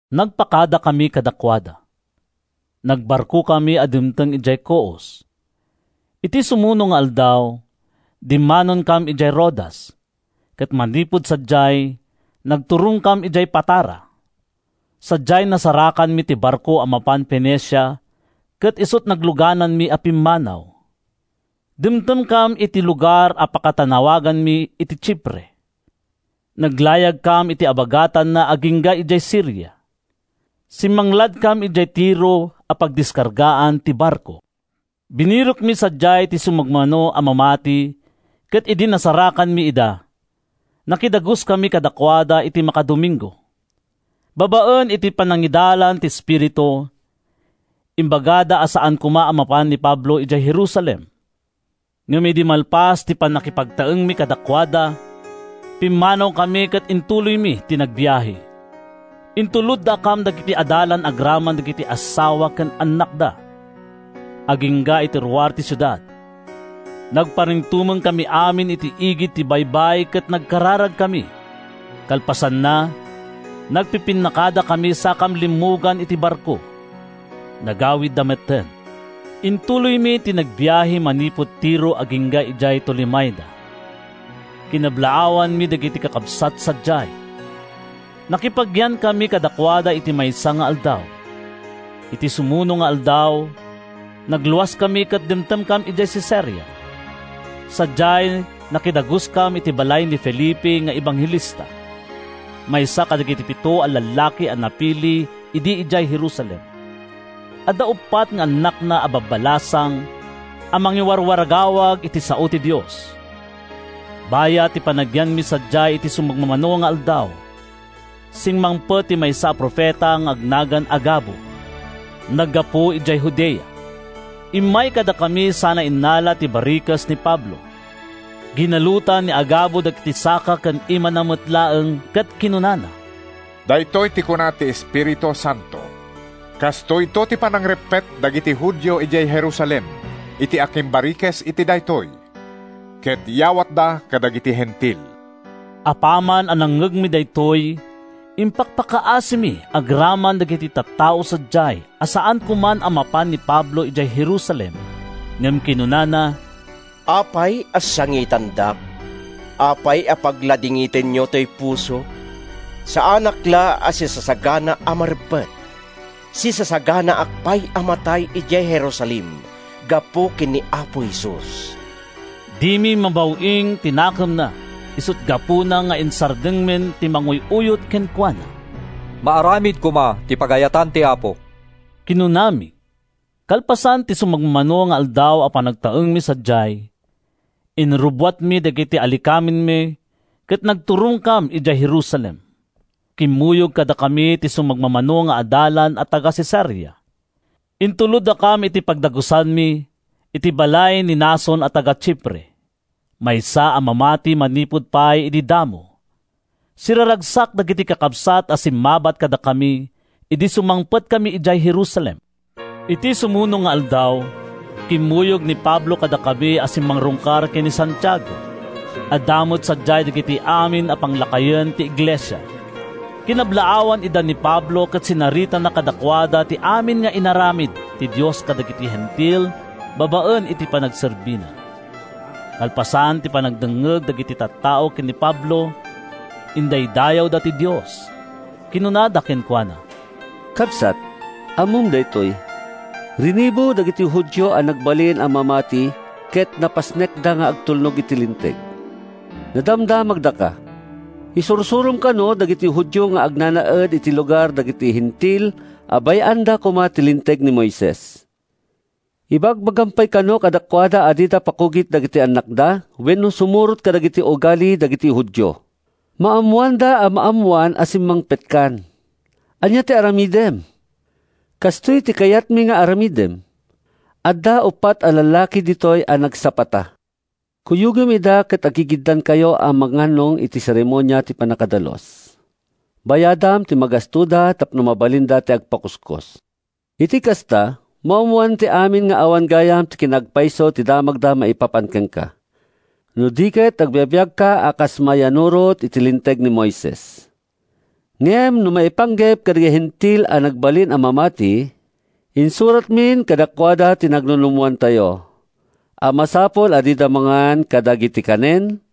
Nagpakadakami kadakuada. Nagbarkokami a dimteng idiay Coos. Iti sumuno nga aldaw, dimmanonkam idiay Rodas, ket manipud sadiay, nagturongkam idiay Patara. Sadiay, nasarakanmi ti barko a mapan Fenicia ket isut’ naglugananmi a pimmanaw. Dimtengkam iti lugar a pakatannawaganmi iti Chipre. Naglayagkam iti abagatanna agingga idiay Siria. Simmangladkam idiay Tiro a pagdiskargaan ti barko. Binirokmi sadiay ti sumagmamano a mamati ket idi nasarakanmi ida, nakidaguskami kadakuada iti makadomingo. Babaen iti panangidalan ti Espiritu, imbagada a saan koma a mapan ni Pablo idiay Jerusalem. Ngem idi malpas ti pannakipagtaengmi kadakuada, pimmanawkami ket intuloymi ti nagbiahe. Intuloddakam dagiti adalan agraman dagiti assawa ken annakda, agingga iti ruar ti siudad. Nagparintumengkami amin iti igid ti baybay ket nagkararagkami. Kalpasanna, nagpipinnakadakami sakam limmugan iti barko. Nagawidda metten. Intuloymi ti nagbiahe manipud Tiro agingga idiay Tolemaida. Kinablaawanmi dagiti kakabsat sadiay. Nakipagyankami kadakuada iti maysa nga aldaw. Iti sumuno nga aldaw, nagluaskami ket dimtengkam idiay Cesarea. Sadiay, nakidaguskam iti balay ni Felipe nga ebanghelista, maysa kadagiti pito a lallaki a napili idi idiay Jerusalem. Adda uppat nga annakna a babbalasang a mangiwarwaragawag iti sao ti Dios. Bayat ti panagyanmi sadiay iti sumagmamano nga aldaw, simmangpet ti maysa a profeta nga agnagan Agabo. Naggapu idiay Judea. Immay kadakami sana innala ti barikes ni Pablo. Ginalutan ni Agabo dagiti saka ken imana met laeng ket kinunana, “Daytoy ti kuna ti Espiritu Santo: Kastoyto ti panangreppet dagiti Judio idiay Jerusalem iti akimbarikes iti daytoy, ket yawatda kadagiti Hentil.” Apaman a nangngegmi daytoy, impakpakaasimi agraman dagiti tattao sadiay a saan koman a mapan ni Pablo idiay Jerusalem. Ngem kinunana, “Apay a sangitandak? Apay a pagladingitenyo ’toy pusok? Saanak la a sisasagana a mareppet. Sisasaganaak pay a matay idiay Jerusalem gapu ken ni Apo Jesus.” Dimi mabaw-ing ti nakemna, isut’ gapuna nga insardengmin ti manguy-uyot kenkuana. “Maaramid koma ti pagayatan ti Apo,” kinunami. Kalpasan ti sumagmamano nga aldaw a panagtaengmi sadiay, inrubbuatmi dagiti alikamenmi ket nagturongkam idiay Jerusalem. Kimmuyog kadakami ti sumagmamano nga adalan a taga-Cesarea. Intuloddakam iti pagdagusanmi, iti balay ni Mnason a taga-Chipre, maysa a mamati manipud pay idi damo. Siraragsak dagiti kakabsat a simmabat kadakami idi sumangpetkami idiay Jerusalem. Iti sumuno nga aldaw, kimmuyog ni Pablo kadakami a simmarungkar ken ni Santiago. Adda met sadiay dagiti amin a panglakayen ti iglesia. Kinablaawan ida ni Pablo ket sinaritana kadakuada ti amin nga inaramid ti Dios kadagiti Hentil babaen iti panagserbina. Kalpasan ti panagdengngeg dagiti tattao ken ni Pablo, indaydayawda ti Dios. Kinunada kenkuana: “Kabsat, ammom daytoy. Rinibu dagiti Judio a nagbalin a mamati ket napasnekda nga agtulnog iti Linteg. Nadamdamagdaka. Isursurom kano dagiti Judio nga agnanaed iti lugar dagiti Hentil a bay-anda koma ti Linteg ni Moises. Ibagbagam pay kano kadakuada a dida pakugit dagiti annakda wenno sumurot kadagiti ugali dagiti Judio. Maammoanda a maammoan a simmangpetkan. Ania ti aramidem? Kastoy ti kayatmi nga aramidem. Adda uppat a lallaki ditoy a nagsapata. Kuyogem ida ket aggigiddankayo a mangannong iti seremonia ti pannakadalus. Bayadam ti magastoda tapno mabalinda ti agpakuskos. Iti kasta, maammoan ti amin nga awan gayam ti kinaagpayso ti damagda maipapan kenka, no di ket agbibiagka a kas mayannurot iti Linteg ni Moises. Ngem no maipanggep kadagiti Hentil a nagbalin a mamati, insuratmin kadakuada ti nagnunummoantayo a masapul a dida mangan kadagiti kanen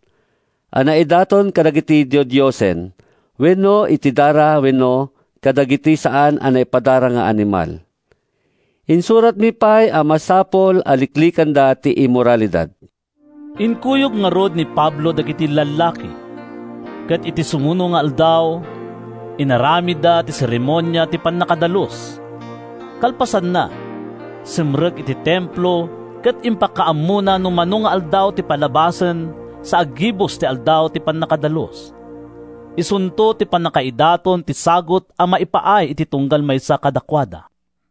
a naidaton kadagiti didiosen wenno iti dara wenno kadagiti saan a napadara nga animal. Insuratmi pay a masapul a liklikanda ti immoralidad.” Inkuyog ngarud ni Pablo dagiti lallaki, ket iti sumuno nga aldaw, inaramidda ti seremonia ti pannakadalus. Kalpasanna, simrek iti Templo ket impakaammona no mano nga aldaw ti palabasen sa aggibus ti aldaw ti pannakadalus. Isunton ti pannakaidaton ti sagut a maipaay iti tunggal maysa kadakuada.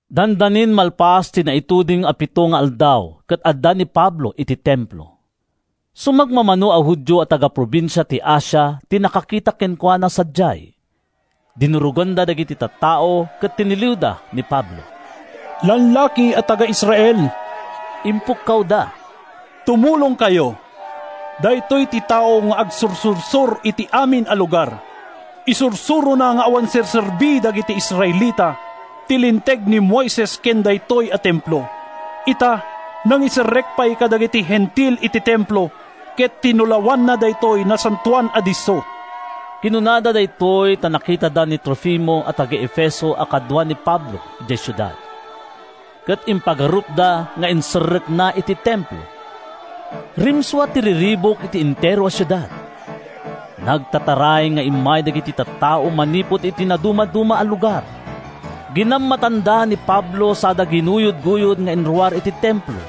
Dandanin malpas ti naituding a pito nga aldaw ket adda ni Pablo iti Templo. Sumagmamano a Judio a taga-probinsia ti Asia ti nakakita kenkuana sadiay. Dinuroganda dagiti tattao ket tiniliwda ni Pablo. “Lallaki a taga-Israel,” impukkawda, “tumulongkayo! Daytoy ti tao nga agsursursor iti amin a lugar. Isursurona nga awan serserbi dagiti Israelita, ti Linteg ni Moises ken daytoy a Templo. Ita, nangiserrek pay kadagiti Hentil iti Templo ket tinulawanna daytoy nasantoan a disso.” ( Kinunada daytoy ta nakitada ni Trofimo a taga-Efeso a kadua ni Pablo idiay siudad, ket impagarupda nga inserrekna iti Templo.) Rimsua ti riribuk iti entero a siudad. Nagtataray nga immay dagiti tattao manipud iti nadumaduma a lugar. Ginammatanda ni Pablo sada ginuyodguyod nga inruar iti Templo.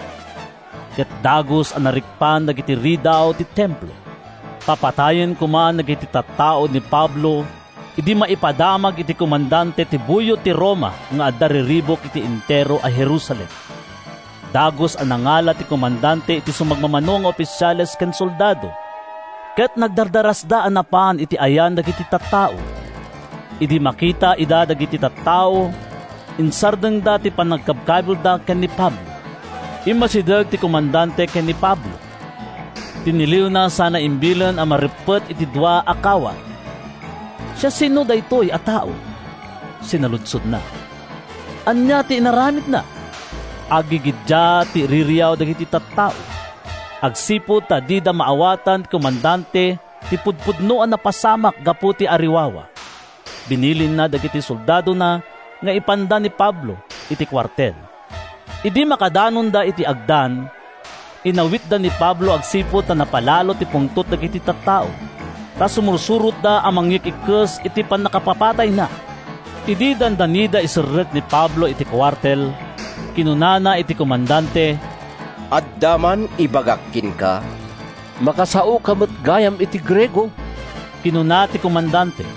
Ket dagus a narikpan dagiti ridaw ti Templo. Papatayen koman dagiti tattao ni Pablo idi maipadamag iti komandante ti buyot ti Roma nga adda riribuk iti entero a Jerusalem. Dagus a nangala ti komandante iti sumagmamano nga ofisiales ken soldado, ket nagdardarasda a napan iti ayan dagiti tattao. Idi makita ida dagiti tattao, insardengda ti panangkabkabilda ken ni Pablo. Immasideg ti komandante ken ni Pablo. Tiniliwna sana imbilin a mareppet iti dua a kawar. “Siasino daytoy a tao?” sinaludsodna. “Ania ti inaramidna?” Aggigiddiat ti iririaw dagiti tattao. Agsipud ta di maawatan ti komandante ti pudpudno a napasamak gapu iti ariwawa, binilinna dagiti soldadona nga ipanda ni Pablo iti kuartel. Idi makadanonda iti agdan, inawitda ni Pablo agsipud ta napalalo ti pungtot dagiti tattao. Ta sumursurotda a mangyik-ikkis iti pannakapapatayna. Idi dandanida iserrek ni Pablo iti kuartel, kinunana iti komandante, “Adda man ibagak kenka.” “Makasaoka met gayam iti Griego,” kinuna ti komandante.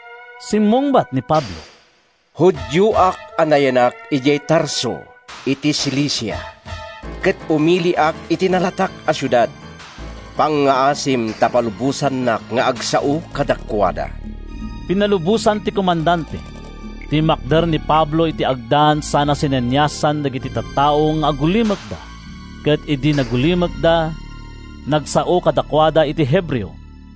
Simmungbat ni Pablo: “Judioak a nayanak idiay Tarso iti Cilicia ket umiliak iti nalatak a siudad. Pangngaasim ta palubosannak nga agsao kadakuada.” Pinalubosan ti komandante. Timmakder ni Pablo iti agdan sana sineniasan dagiti tattao nga agulimekda. Ket idi nagulimekda, nagsao kadakuada iti Hebreo: